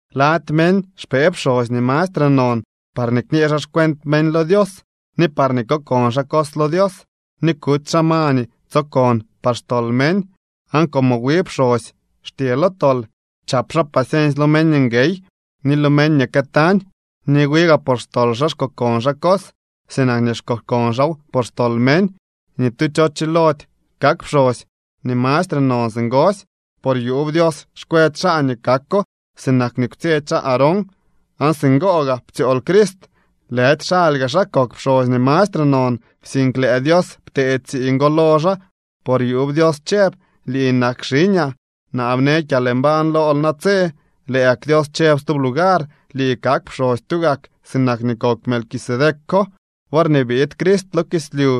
Lady meñ xpee pxosy nii mastre non parñee kñee xaa xcuent meñ lo Dios, ni parñee kokon xaa cos lo Dios, ni kuty xaa ma nii tsokon par xtol meñ. Aan como wi pxosy xtye lo tol, chap xaa paciensy lo meñ nguey ni lo meñ nii këtañ. Ni wi gaa por xtol xaa xkokon xaa cos, sinak nii xkokon xaaw por xtol meñ. Ni tu cho chilody kak pxosy nii mastre non singosy, por yuub Dios xkwetsy xaa nii kako sinak nii kwtsyetsy xaa Aarón. Aan singo gaa ptsyool Crist. Lëdy xaly gaa xaa kok pxosy nii mastre non, sink lëë Dios ptee tsiiñ go lo xaa, por yuub Dios chëb: Lii nak xiñaa. Naa bne kyalmbañ lool natse. Lëë gak Dios chëb stub lugar: Lii kak pxosy tugak, sinak nii kok Melquisedeco. Worñee biid Crist lo kislyu,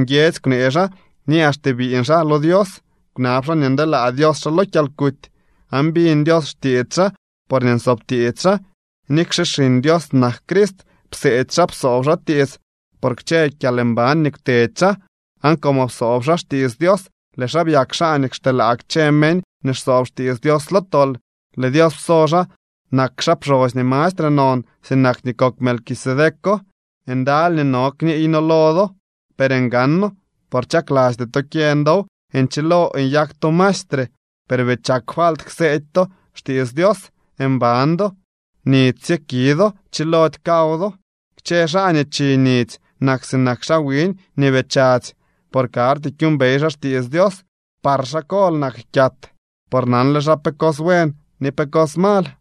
nguiedzy kwnee xaa ni axte biiñ xaa lo Dios, kwnab xaa nii ndeelaa Dios xaa lo kyalkuty. Aan biñ Dios xtiits xaa, porñee nsoob tiits xaa. Nikxe Xiñ Dios nak Crist, pseedy xaa, psoob xaa tiits por kchë kyalmban nii kwtedy xaa. Aan como psoob xaa xtiits Dios, lëë xaa byak xaa nii xteelaa kchë meñ nii xsoob xtiits Dios lo tol. Lëë Dios pso xaa nak xaa pxosy nii mastre non, sinak nii kok Melquisedeco. Ndaly nii no kniiy noo lo do, per ngano, por chaklasty to kyeñ dow. Nchilol nyak to maestre, per bii chak falt kseedy to xtiits Dios. Mban do, nidzy sye ki do, chilody kaw do. Kchë xaa nii chi nidzy nak sinak xaa wiñ nii bii chadzy, por karty kyuumbey xaa xtiits Dios. Par xaa kol nak kyat, por nanle xaa pe cos buen ni pe cos mal.